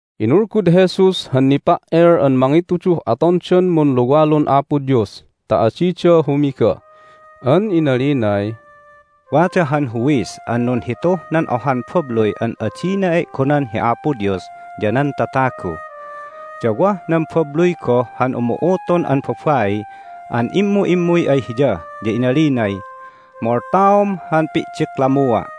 Inulgud Jesus han nipa"el an mangituduh atondan munluwalun Apo Dios ta adida humiga. An inalinay, "Wada han huwis an nunhituh nan ohan babluy an adina e'gonan hi Apo Dios ya nan tatagu. Ya wah nan babluy goh han umu'utun an babai an immu'immuy ay hiya, ya inalinay, Moltaom han pi'diklammua'!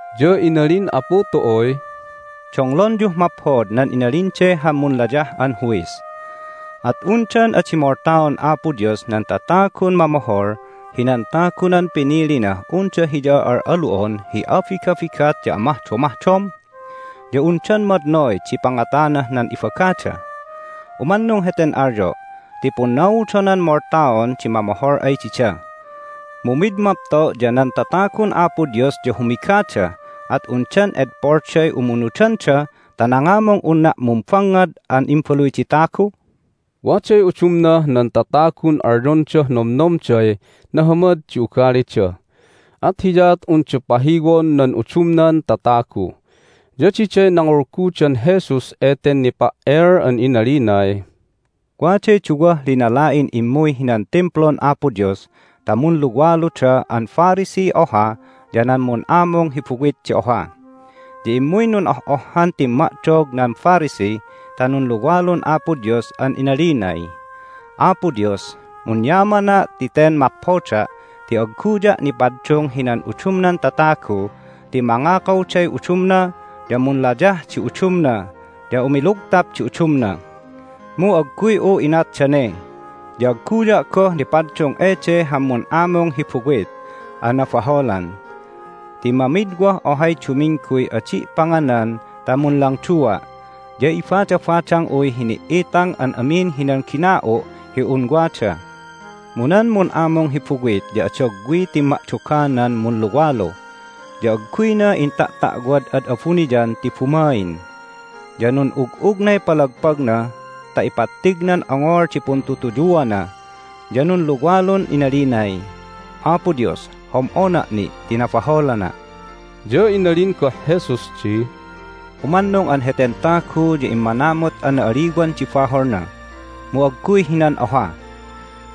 Ya inalin Apu tu'uy, "Donglonyuh maphod nan inalin de han munlayah an huwis. At undan adi moltaon Apo Dios nan tatagun mamohol hinan tagunan pinilinah unda Hiya al'alu'on hi abigabigat ya amahdomahdom? Ya undan madnoy di pangatanah nan ibagada? Umannung heten alyo' ti punnaudonan moltaon di mamohol ay dida. Mu mid mapto' ya nan tatagun Apo Dios ya humigada, at undan edpolday umunudanda ta nangamung unna' mumbangngad an Imbaluy di Tagu?" Waday udumnah nan tatagun alyondah nomnomday nahamad di ugalida, at hiyaat unda pahiwon nan udumnan tatagu. Ya diday nangulgudan Jesus eten nipa"el an inalinay, "Waday duwah linala'in immuy hinan Timplun Apo Dios ta munluwaluda an Phariseey oha, ya nan mun'amung hi buwit di oha. Ya immuy nun'oh'ohhan timma'dog nan Pharisee ta nunluwalun Apo Dios an inalinay, Apo Dios, munyamana' ti ten maphoda' ti agguya' nipaddung hinan udumnan tatagu ti mangakawday udumna, ya munlayah di udumna, ya umilugtap di udumna. Mu agguy'u inat dane, ya agguya' goh nipaddung ede han mun'amung hi buwit an nabaholan. Ti mamidwah ohay dumingguy adi' panganan ta munlangdua', ya ibadabadang'uy hini"itang an amin hinan gina'u' hi un wada. Mu nan mun'amung hi buwit ya adagwiy timma'doganan munluwalu, ya agguyna inta'ta'wad ad abuniyan ti bumain, ya nun'ug'ugnay palagpagna ta ipattignan ongol di puntutuyuana. Ya nunluwalun inalinay, Apo Dios, hom'ona' ni' ti nabaholana'!" Ya inalin goh Jesus di, "Umannung an heten tagu ya immanamut an na'aliwan di baholna, mu agguy hinan oha.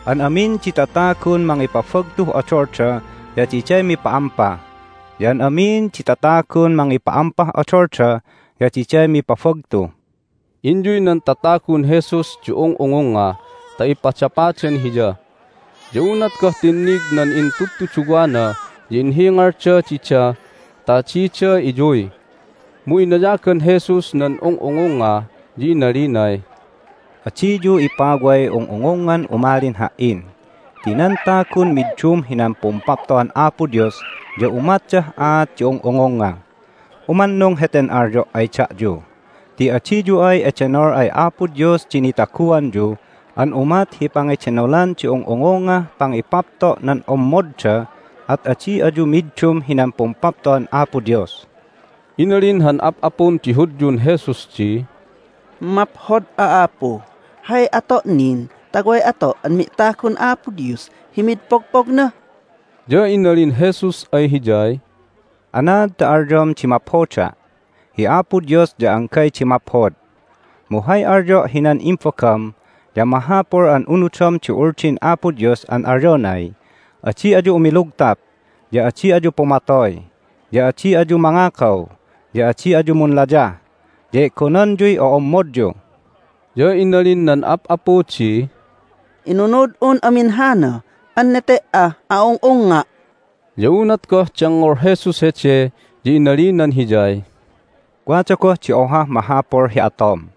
An amin di tatagun mangipabagtuh odolda ya diday mipa'ampa, ya an amin di tatagun mangipa'ampah odolda ya diday mipabagtu." Inyuy nan tatagun Jesus di ung'ungungnga ta ipadapadan Hiya. Ya unat goh tinnig nan intudtuduwana ya inhingalda dida ta adida iyuy. Mu inayagan Jesus nan ung'ungungnga, ya inalinay, "Adiyu ipaway ung'ungungngan umalin Ha"in ti nan tagun middum hinan Pumpapto'an Apo Dios ya umatdah aat di ung'ungungnga. Umannung heten alyo' ay da'yu, ti adiyu ay edenol ay Apo Dios di nitaguanyu an umat hi pangidenolan di ung'ungungngah pangipapto' nan ommodda at adi ayu middum hinan Pumpapto'an Apo Dios." Inalin han ap'apun di Hudyun Jesus di, " Maphod'a, Apu! Hay ato' nin ta way ato' an mi'tagun Apo Dios hi mid pogpogna?" Ya inalin Jesus ay hiyay, "Anaad ta alyom di maphoda'? Hi Apo Dios ya anggay di maphod! Mu hay alyo' hinan imbagam ya mahapul an unudom di Uldin Apo Dios an alyonay, Adi ayu umilugtap, ya adi ayu pumatoy, ya adi ayu mangakaw, ya adi ayu munlayah, ya e'gonanyuy o'ommodyu." Ya inalin nan ap'apu di, "Inunud'un amin hana an nete"ah a'ung'ungnga'!" Ya unat goh dengngol Jesus hede ya inalinan hiyay, "Wada goh di ohah mahapul hi atom.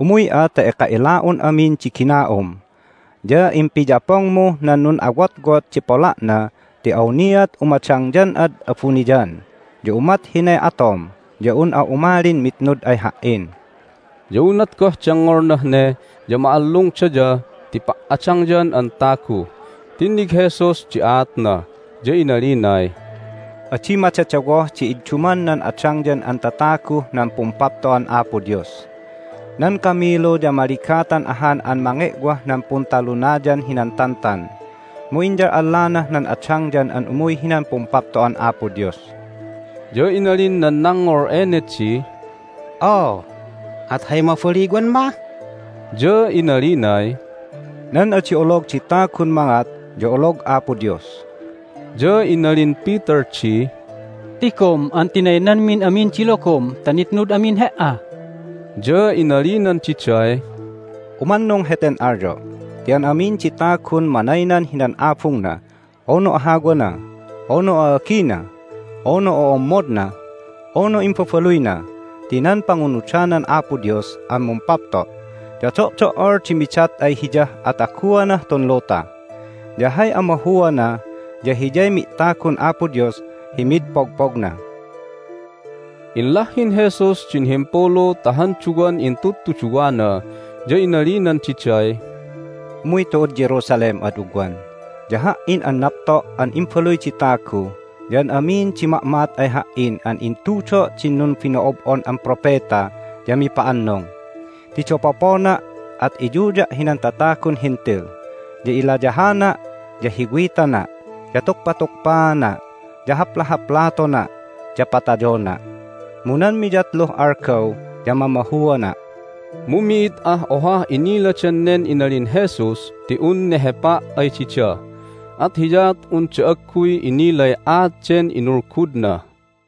Umuy'a ta eka ila'un amin di gina'um, ya impiyapongmuh nan nun'awotwot di pola'na ti awniat umadangyan'ad abuniyan, ya umat hinay atom ya un'a umalin mitnud ay Ha"in." Ya unat goh dengngolnah ne ya ma'allungdaya ti pa"adangyan an tagu. Tinnig Jesus di aatna, ya inalinay, "Adi madadawoh di idduman nan adangyan an tataguh nan Pumpapto'an Apo Dios! Nan kamilu ya maligatan ahan an mange'wah nan Puntalunayan hinan Tantan, mu inyal'allanah nan adangyan an umuy hinan Pumpapto'an Apo Dios." Ya inalin nan nangngol ene di, "Oo, at hay mabaliwan mah?" Ya inalinay, "Nan adi olog di tagun mangat ya olog Apo Dios." Ya inalin Peter di, "Tigom an tinaynanmin amin di logom ta nitnud amin He"a!" Ya inalinan diday, "Umannung heten alyo' ti an amin di tagun manaynan hinan abungna, unu ahawana, unu a'agina, unu o'ommodna, unu imbabaluyna ti nan pangunudanan Apo Dios an mumpapto' ya do'do"ol di midat ay hiyah ataguanah tun luta, ya hay amahuana ya hiyay mi'tagun Apo Dios hi mid pogpogna." Inlahhin Jesus din himpulu ta han duwan intudtuduwana, ya inalinan diday, "Umuy tu'ud Jerusalem ad ugwan, ya Ha"in an napto' an Imbaluy di Tagu ya an amin di ma'ma'at ay Ha"in an intudo' din numbino'ob'on an propeta ya mipa'annung. Ti dapopona', at iyuya' hinan tatagun Hentil, ya ilayahana', ya hiwitana', ya tukpatukpaana', ya haplahaplatona', ya patayona'. Mu nan miyatluh algaw ya mamahuana'." Mu mi'id ah ohah iniladan nen inalin Jesus ti un nehepa' ay dida, at hiyaat unda agguy inilay aat den inulgudna.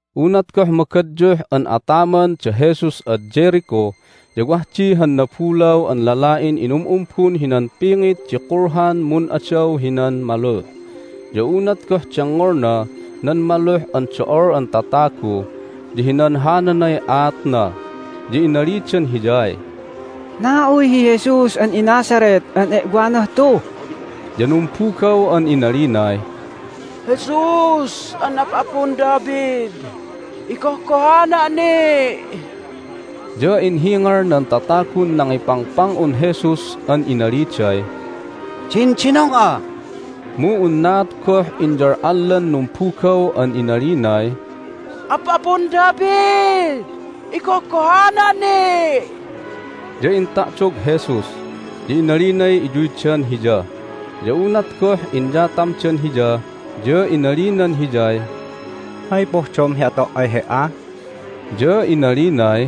Unat goh magadyuh an ataman da Jesus ad Jericho ya wah di han nabulaw an lala'in inum'umbun hinan pingit di kulhan mun'adaw hinan maluh. Ya unat goh dengngolna nan maluh an do'ol an tatagu ya hinanhananay aatna. Ya inalidan hiyay, "Na'uy hi Jesus an iNazareth an e'wanah tu." Ya numbugaw an inalinay, "Jesus an Ap'apun David, igohgohana' ni'!" Ya inhingal nan tatagun nangipangpang'un Jesus an inaliday, "Dindinong'a!" Mu unaat goh inyal'allan numbugaw an inalinay, "Ap'apun David, igohgohana' ni'!" Ya inta'dog Jesus, ya inalinay iyuydan Hiya. Ya unat goh inyatamdan Hiya ya inalinan hiyay, "Hay pohdom hi ato' ay he"a?" Ya inalinay,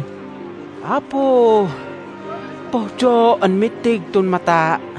"Apu, pohdo' an mittig tun mata'!"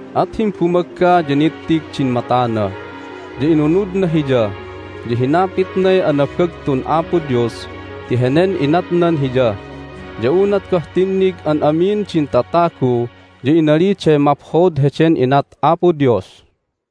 At himbumagga ya nittig din matana, ya inunudna Hiya, ya hinapitnay anabagtun Apo Dios ti henen inatnan hiya. Ya unat goh tinnig an amin din tatagu ya inaliday maphod heden inat Apo Dios.